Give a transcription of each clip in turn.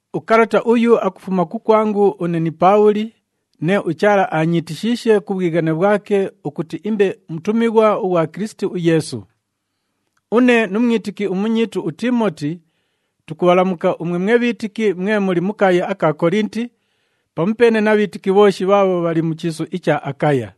Ukalata uyu akufuma kukwangu une ni Paabhuli, nee uChaala aanyiitishiishe ku bhwighane bhwake ukuti imbe mutumighwa ughwa Kilisiti uYeesu. Une nu mwitiki umunyiitu uTiimoti tukubhalamuka umwe mwe bhiitiki mwe muli mu kaaya aka Kolinti, pamupeene na bhiitiki bhooshi bhaabho bhali mu chiisu icha Akaya.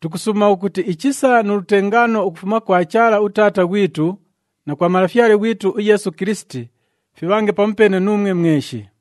Tukusuuma ukuti ichisa nu lutengaano ukufuma kwa Chaala uTaata ghwitu na kwa Malafyale ghwitu uYeesu Kilisiti fibhange pamupeene nuumwe mweshi.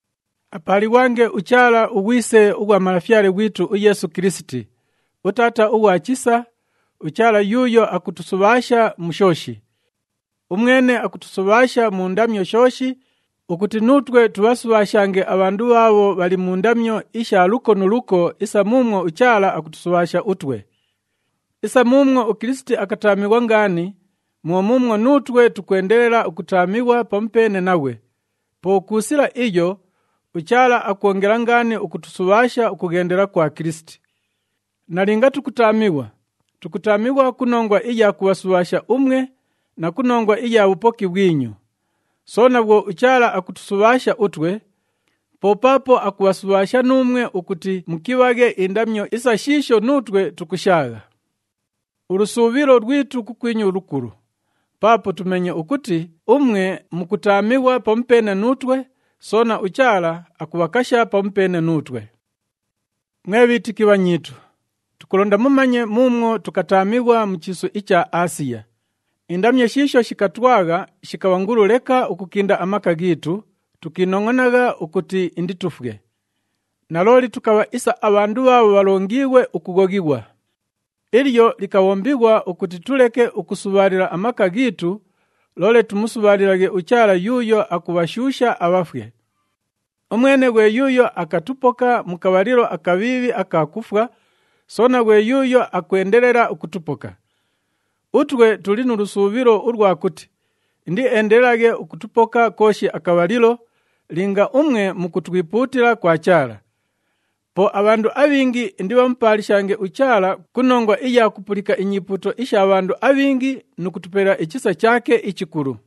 Apaalighwange uChaala, uGhwise ughwa Malafyale ghwitu uYeesu Kilisiti, uTaata ughwa chisa, uChaala yuuyo akutusubhaasha mu shooshi. Umwene akutusubhaasha mu ndamyo shooshi ukuti nuutwe tubhasubhaashange abhandu bhaabho bhali mu ndamyo isha luko nu luko isa muumwo uChaala akutusubhaasha utwe. Isa muumwo uKilisiti akataamighwa ngaani mwo muumwo nuutwe tukwendelela ukutaamighwa pamupeene naghwe, po ku sila iyo uChaala akwongela ngaani ukutusubhaasha ukughendela kwa Kilisiti. Nalinga tukutaamighwa, tukutaamighwa ku nongwa iya kubhasubhaasha umwe na ku nongwa iya bhupoki bhwinyu. Soona bhwo uChaala akutusubhaasha utwe, po paapo akubhasubhaasha nuumwe ukuti mukibhaghe indamyo isa shiisho nuutwe tukushaagha. Ulusuubhilo lwitu kukwinyu lukulu, paapo tumeenye ukuti umwe mukutaamighwa pamupeene nuutwe, soona uChaala akubhakasha pamupeene nuutwe. Mwe bhiitiki bhanyiitu, tukulonda mumanye muumwo tukataamighwa mu chiisu icha Aasiya. Indamyo shiisho shikatwagha shikabha ngulu leka ukukinda amaka ghiitu, tukiinongʼonagha ukuti inditufwe. Nalooli tukabha isa abhandu bhaabho bhalongiighwe ukughoghighwa. Ilyo likabhombighwa ukuti tuleke ukusubhaalila amaka ghiitu, loole tumusubhaalilaghe uChaala yuuyo akubhashuusha abhafwe. Umwene ghwe yuuyo akatupoka mu kabhalilo akabhiibhi aka kufwa, soona ghwe yuuyo akwendelela ukutupoka. Utwe tuli nu lusuubhilo ulwa kuti indieendelelaghe ukutupoka kooshi akabhalilo, linga umwe mukutwipuutila kwa Chaala. Po abhandu abhingi indibhamupaalishange uChaala ku nongwa iya kupulika inyipuuto isha bhandu abhingi nu kutupelela ichisa chaake ichikulu.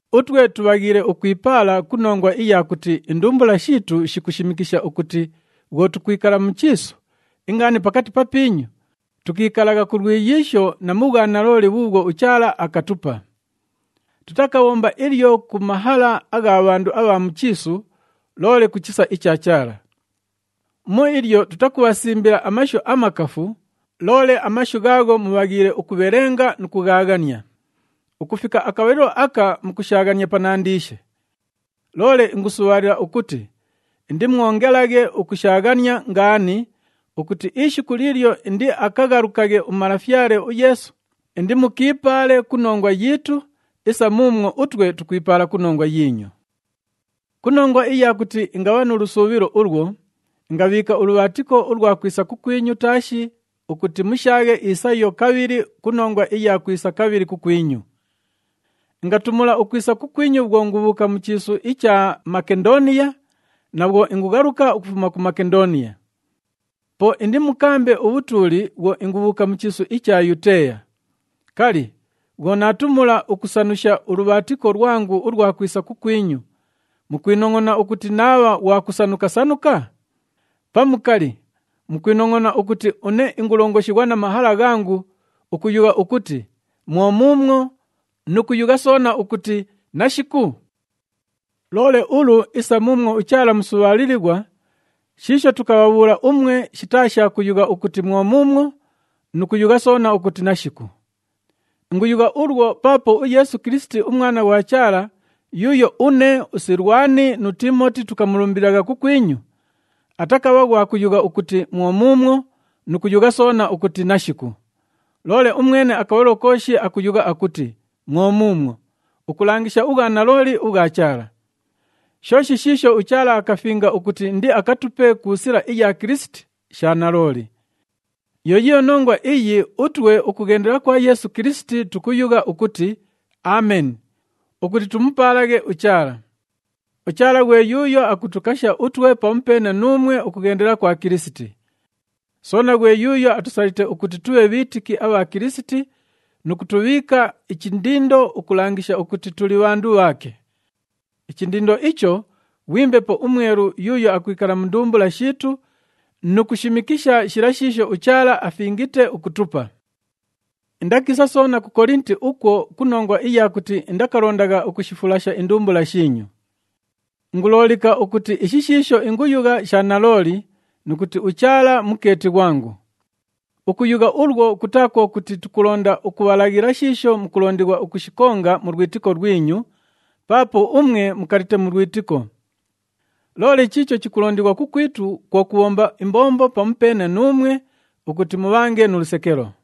Utwe tubhaghiile ukwipaala ku nongwa iya kuti indumbula shiitu shikushimikisha ukuti bhwo tukwikala mu chiisu, ingaani pakati papiinyu, tukiikalagha ku lwiyiisho na mu bhwanalooli bhuubhwo uChaala akatupa. Tutakabhomba ilyo ku mahala agha bhandu abha mu chiisu, loole ku chisa icha Chaala. Mu ilyo, tutakubhasimbila amashu amakafu, loole amashu ghaagho mubhaghiile ukubhelenga nu kughaaghania. Ukufika akabhalilo aka mukushaaghania panandiishe. Loole ingusubhaalila ukuti indimwongelaghe ukushaaghania ngaani, ukuti ishiku liilyo indiakaghalukaghe uMalafyale uYeesu, indimukiipaale ku nongwa yiitu, isa muumwo utwe tukwipaala ku nongwa yiinyu. Ku nongwa iya kuti ingabha nu lusuubhilo ulwo, ingabhiika ulubhaatiko ulwa kwisa kukwinyu taashi ukuti mushaaghe isayo kabhili ku nongwa iya kwisa kabhili kukwinyu. Ingatumula ukwisa kukwinyu bhwo ingubhuuka mu chiisu icha Makendooniya na bhwo ingughaluka ukufuma ku Makendooniya. Po indimukaambe ubhutuuli bhwo ingubhuuka mu chiisu icha Yuteeya. Kali, bhwo naatumula ukusanusha ulubhaatiko lwangu ulwa kwisa kukwinyu, mukwinongʼona ukuti naabha ghwa kusanuka-sanuka? Pamu kali, mukwinongʼona ukuti une ingulongoshighwa na mahala ghangu, ukuyugha ukuti, “Mwo muumwo,” nu kuyugha soona ukuti, “Nashiku”? Loole ulu, isa muumwo uChaala musubhaalilighwa, shiisho tukabhabhuula umwe, shitaa sha kuyugha ukuti, “Mwo muumwo,” nu kuyugha soona ukuti, “Nashiku.” Inguyugha ulwo paapo uYeesu Kilisiti, uMwana ughwa Chaala yuuyo une, uSilwani nu Tiimoti tukamulumbililagha kukwinyu, atakabha ghwa kuyugha ukuti, “Mwo muumwo,” nu kuyugha soona ukuti, “Nashiku.” Loole umwene akabhalilo kooshi akuyugha ukuti, “Mwo muumwo,” ukulangisha ubhwanalooli ubhwa Chaala. Shooshi shiisho uChaala akafinga ukuti indiakatupe ku sila iya Kilisiti, sha nalooli. Yo yiiyo nongwa iyi utwe ukughendela kwa Yeesu Kilisiti tukuyugha ukuti, “Ameni,” ukuti tumupaalaghe uChaala. UChaala ghwe yuuyo akutukasha utwe pamupeene nuumwe ukughendela kwa Kilisiti. Soona ghwe yuuyo atusalite ukuti tubhe bhiitiki abha Kilisiti, nu kutubhiika ichindindo ukulangisha ukuti tuli bhandu bhaake. Ichindindo icho ghwi Mbepo uMwelu yuuyo akwikala mu ndumbula shiitu nu kushimikisha shila shiisho uChaala afingite ukutupa. Indakiisa soona ku Kolinti ukwo ku nongwa iya kuti indakalondagha ukushifulasha indumbula shiinyu. Inguloolika ukuti ishi shiisho inguyugha sha nalooli nu kuti uChaala mukeeti ghwangu. Ukuyugha ulwo kutaa kwo kuti tukulonda ukubhalaghila shiisho mukulondighwa ukushikonga mu lwitiko lwinyu, paapo umwe mukalite mu lwitiko. Loole chiicho chikulondighwa kukwitu, kwo kubhomba imbombo pamupeene nuumwe ukuti mubhange nu lusekelo.